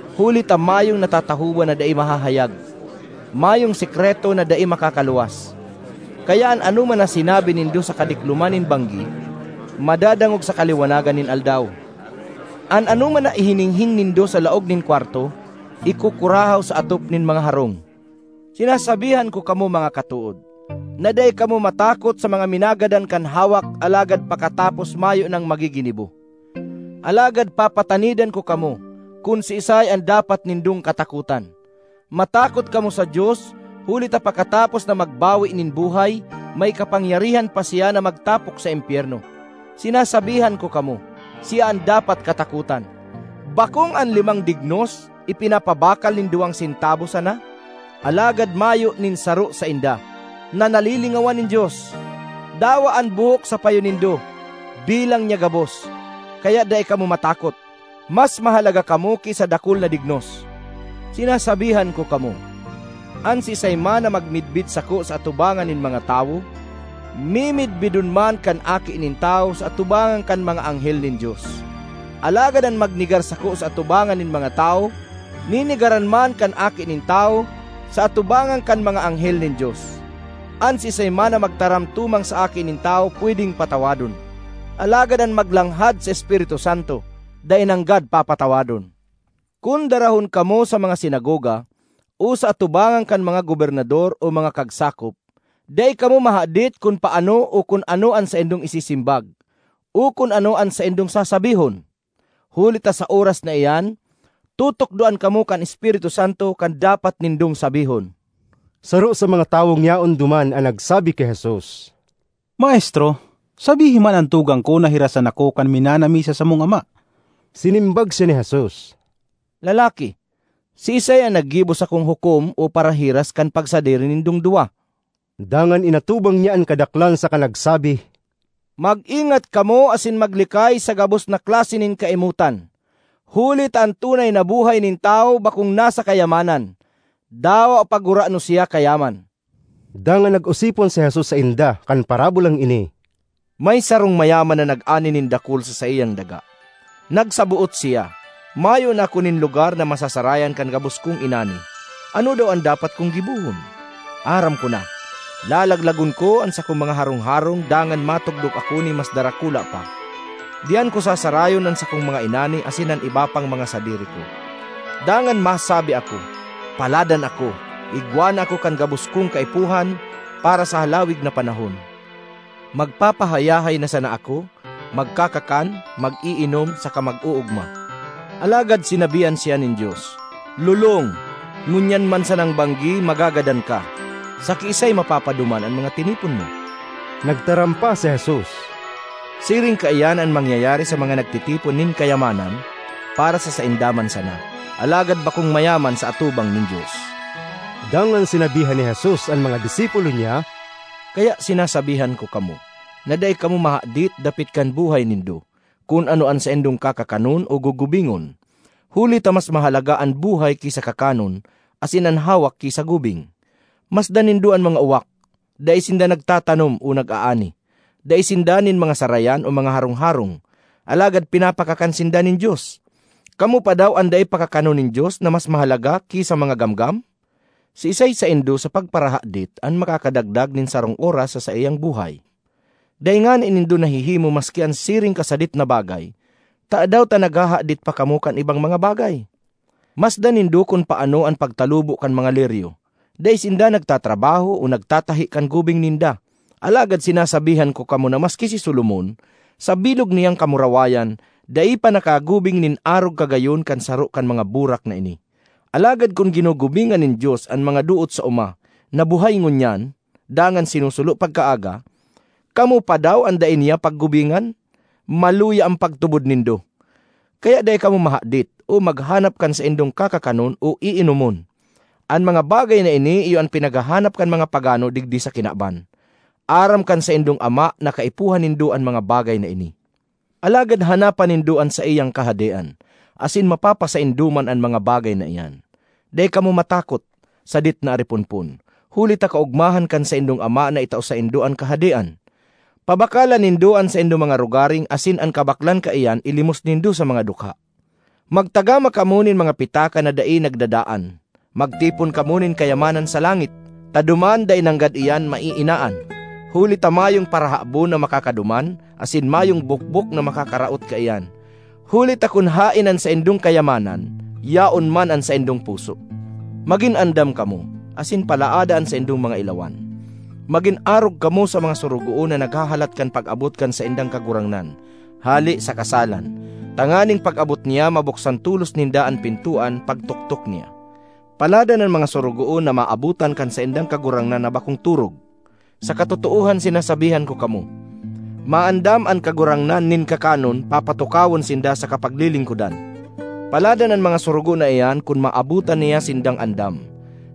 Huli ta mayong natatahoban na dai mahahayag; mayong sekreto na dai makakaluwas. Kaya an anoman na sinabi nindo sa kadikloman nin banggi, madadangog sa kaliwanagan nin aldaw; an anoman na ihininghing nindo sa laog nin kwarto, ikukurahaw sa atop nin mga harong. ”Sinasabihan ko kamo, mga katood, na dai kamo matakot sa mga minagadan kan hawak alagad pakatapos mayo nang magiginibo. Alagad papatanidan ko kamo kun siisay an dapat nindong katakotan: matakot kamo sa Dios huli ta pakatapos na magbawe nin buhay, may kapangyarihan pa siya na magtapok sa impyerno! Sinasabihan ko kamo, siya an dapat katakotan. ”Bakong an limang dignos ipinapabakal nin duwang sentabo sana? Alagad mayo nin saro sainda na nalilingawan nin Dios. Dawa an buhok sa payo nindo, bilang niya gabos. Kaya dai kamo matakot! Mas mahalaga kamo ki sa dakul na dignos! ”Sinasabihan ko kamo, an siisay man na magmidbid sako sa atubangan nin mga tawo, mimidbidon man kan Aki nin Tawo sa atubangan kan mga anghel nin Dios; alagad an magnegar sako sa atubangan nin mga tawo, nenegaran man kan Aki nin Tawo sa atubangan kan mga anghel nin Dios. ”An siisay man na magtaram tumang sa Aki nin Tawo pwedeng patawadon; alagad an maglanghad sa Espiritu Santo dai nanggad papatawadon. ”Kun darahon kamo sa mga sinagoga o sa atubangan kan mga gobernador o mga kagsakop, dai kamo mahadit kun paano o kun ano an saindong isisimbag o kun ano an saindong sasabihon. Huli ta sa oras na iyan, tutukdoan kamo kan Espiritu Santo kan dapat nindong sabihon.” Saro sa mga tawong yaon duman an nagsabi ki Jesus, “Maestro, sabihi man an tugang ko na hirasan ako kan minana mi sa samong ama.” Sinimbag siya ni Jesus, “Lalaki, siisay an naggibo sakong hukom o parahiras kan pagsadiri nindong duwa?” Dangan inatubang niya an kadaklan saka nagsabi, “Mag-ingat kamo asin maglikay sa gabos na klase nin kaimotan, huli ta an tunay na buhay nin tawo bakong nasa kayamanan, dawa pa gurano siya kayaman.” Dangan nag-osipon si Jesus sainda kan parabolang ini, “May sarong mayaman na nag-ani nin dakul sa saiyang daga. Nagsaboot siya, ‘Mayo na ako nin lugar na masasarayan kan gabos kong inani. Ano daw an dapat kong gibohon? Aram ko na! Lalaglagon ko an sakong mga harong-harong dangan matugdok ako nin mas darakula pa. Diyan ko sasarayon an sakong mga inani asin an iba pang mga sadiri ko. Dangan masabi ako, Paladan ako! Igwa na ako kan gabos kong kaipuhan para sa halawig na panahon. Magpapahayahay na sana ako, magkakakan, mag-iinom saka mag-oogma!’ Alagad sinabihan siya nin Dios, ‘Lolong! Ngunyan man sanang banggi magagadan ka. Sa kiisay mapapaduman an mga tinipon mo?’" Nagtaram pa si Jesus, “Siring kaiyan an mangyayari sa mga nagtitipon nin kayaman para sa sainda man sana, alagad bakong mayaman sa atubang nin Dios.” Dangan sinabihan ni Jesus an mga disipulo niya, “Kaya sinasabihan ko kamo, na dai kamo mahadit dapit kan buhay nindo, kun ano an saindong kakakanon o gugubingon. Huli ta mas mahalaga an buhay ki sa kakanon asin an hawak ki sa gubing. Masdan nindo an mga uwak: dai sinda nagtatanom o nag-aani; dai sinda nin mga sarayan o mga harong-harong, alagad pinapakakan sinda nin Dios! Kamo pa daw an dai pakakanon nin Dios na mas mahalaga ki sa mga gamgam? Siisay saindo, sa pagparahadit, an makakadagdag nin sarong oras sa saiyang buhay? Dai ngani nindo nahihimo maski an siring kasadit na bagay, tadaw ta naghahadit pa kamo kan ibang mga bagay? Masdan nindo kun paano an pagtalubo kan mga liryo; dai sinda nagtatrabaho o nagtatahi kan gubing ninda. Alagad sinasabihan ko kamo na maski si Solomon, sa bilog niyang kamurawayan, dai pa nakagubing nin arog kagayon kan saro kan mga burak na ini. Alagad kun ginugubingan nin Dios an mga doot sa oma na buhay ngunyan dangan sinusulo pagkaaga, kamo pa daw an dai niya paggubingan? Maluya an pagtubod nindo! Kaya dai kamo mahadit o maghanap kan saindong kakakanon o iinomon. An mga bagay na ini iyo an pinaghahanap kan mga pagano digdi sa kinaban. Aram kan saindong Ama na kaipuhan nindo an mga bagay na ini. Alagad hanapa nindo an saiyang Kahadean asin mapapasaindo man an mga bagay na iyan. ”Dai kamo matakot, sadit na ariponpon, huli ta kaogmahan kan saindong Ama na itao saindo an Kahadean. Pabakalan nindo an saindong mga rogaring asin an kabaklan kaiyan ilimos nindo sa mga dukha. Magtagama kamo nin mga pitaka na dai nagdadaan. Magtipon kamo nin kayamanan sa langit, ta duman dai nanggad iyan maiinaan, huli ta mayong parahabon na makakaduman, asin mayong bokbok na makakaraot kaiyan. Huli ta kun haen an saindong kayamanan, yaon man an saindong puso. ”Magin andam kamo, asin palaada an saindong mga ilawan. Magin arog kamo sa mga sorogoon na naghahalat kan pag-abot kan saindang kagurangnan hale sa kasalan, tanganing pag-abot niya mabuksan tolos ninda an pintoan pagtoktok niya. Paladan an mga sorogoon na maabotan kan saindang kagurangnan na bakong torog! Sa katotoohan sinasabihan ko kamo, maandam an kagurangnan nin kakanon, papatukawon sinda saka paglilingkodan. Paladan an mga sorogoon na iyan kun maabotan niya sindang andam,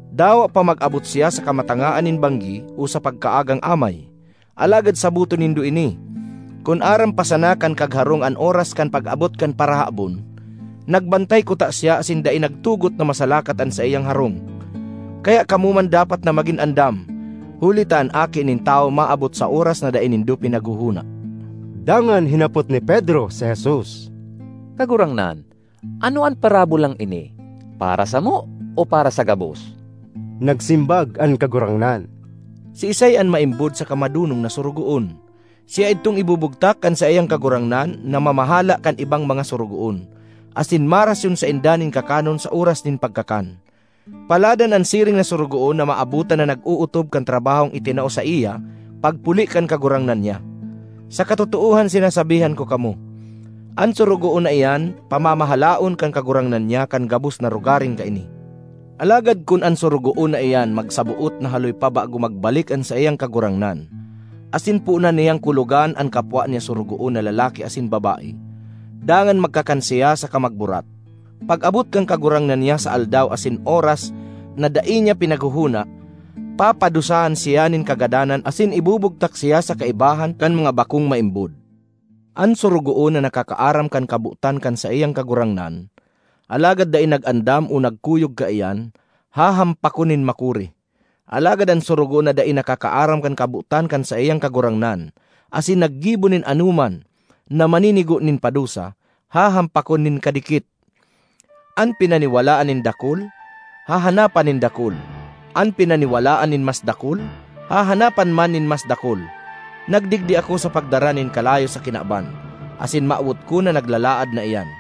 dawa pa mag-abot siya sa kamatangaan nin banggi o sa pagkaagang amay! Alagad saboton nindo ini: kun aram pa sana kan kagharong an oras kan pag-abot kan parahabon, nagbantay kuta siya asin dai nagtugot na masalakat an saiyang harong. Kaya kamo man dapat na magin andam, huli ta an Aki nin Tawo maabot sa oras na dai nindo pinaghohona.” Dangan hinapot ni Pedro si Jesus, “Kagurangnan, ano an parabolang ini, para samo o para sa gabos?” Nagsimbag an Kagurangnan, “Siisay an maimbod saka madonong na sorogoon? Siya idtong ibubugtak kan saiyang kagurangnan na mamahala kan ibang mga sorogoon, asin marasyon sainda nin kakanon sa oras nin pagkakan. Paladan an siring na sorogoon na maabotan na nag-ootob kan trabahong itinao saiya pagpuli kan kagurangnan niya! Sa katotoohan sinasabihan ko kamo, an sorogoon na iyan pamamahalaon kan kagurangnan niya kan gabos na rogaring kaini. Alagad kun an sorogoon na iyan magsaboot na haloy pa bago magbalik an saiyang kagurangnan asin poonan niyang kulogan an kapwa niya sorogoon na lalaki asin babae, dangan magkakan siya saka magburat— pag-abot kan kagurangnan niya sa aldaw asin oras na dai niya pinaghohona, papadusahan siya nin kagadanan asin ibubugtak siya sa kaibahan kan mga bako(ng) maimbod. ”An sorogoon na nakakaaram kan kabotan kan saiyang kagurangnan, alagad dai nag-andam o nagkuyog kaiyan, hahampakon nin makuri. Alagad an sorogoon na dai nakakaaram kan kabotan kan saiyang kagurangnan, asin naggibo nin anoman na maninigo nin padusa, hahampakon nin kadikit. An pinaniwalaan nin dakul, hahanapan nin dakul; an pinaniwalaan nin mas dakul, hahanapan man nin mas dakul. ”Nagdigdi ako sa pagdara nin kalayo sa kinaban, asin mawot ko na naglalaad na iyan!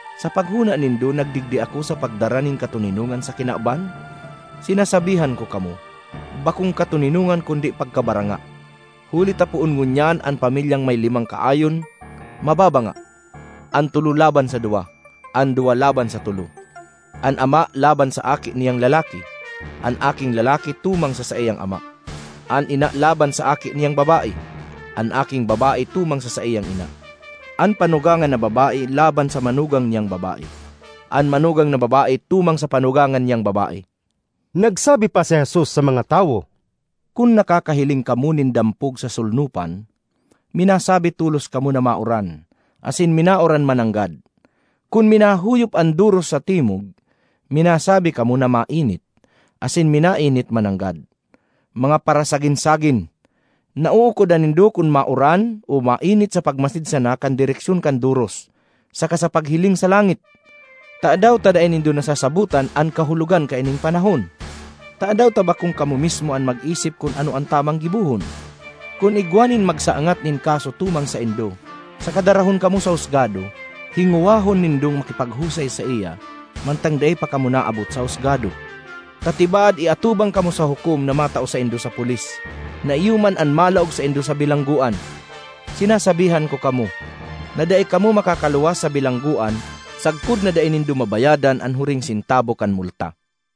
Sa paghona nindo nagdigdi ako sa pagdara nin katoninongan sa kinaban? Sinasabihan ko kamo, bakong katoninongan kundi pagkabaranga. Huli ta poon ngunyan an pamilyang may limang kaayon mababanga: an tolo laban sa duwa, an duwa laban sa tolo. An ama laban sa aki niyang lalaki, an aking lalaki tumang sa saiyang ama; an ina laban sa aki niyang babae, an aking babae tumang sa saiyang ina; an panugangan na babae laban sa manugang niyang babae; an manugang na babae tumang sa panugangan niyang babae.” Nagsabi pa si Jesus sa mga tawo, “Kun nakakahiling kamo nin dampog sa solnopan, minasabi tolos kamo na mauran, asin minauran mananggad. Kun minahuyop an doros sa timog, minasabi kamo na mainit, asin minainit mananggad. Mga parasagin-sagin! Nauukodan nindo kun mauran o mainit sa pagmasid sana kan direksyon kan doros saka sa paghiling sa langit; tadaw ta dai nindo nasasabotan an kahulogan kaining panahon? ”Tadaw ta bakong kamo mismo an mag-isip kun ano an tamang gibohon? Kun igwa nin magsangat nin kaso tumang saindo saka darahon kamo sa husgado, hingowahon nindong makipaghusay saiya mantang dai pa kamo naabot sa husgado, ta tibaad iatubang kamo sa hukom na matao saindo sa pulis, na iyo man an malaog saindo sa bilanggoan. Sinasabihan ko kamo, na dai kamo makakaluwas sa bilanggoan sagkod na dai nindo mabayadan an huring sentabo kan multa.”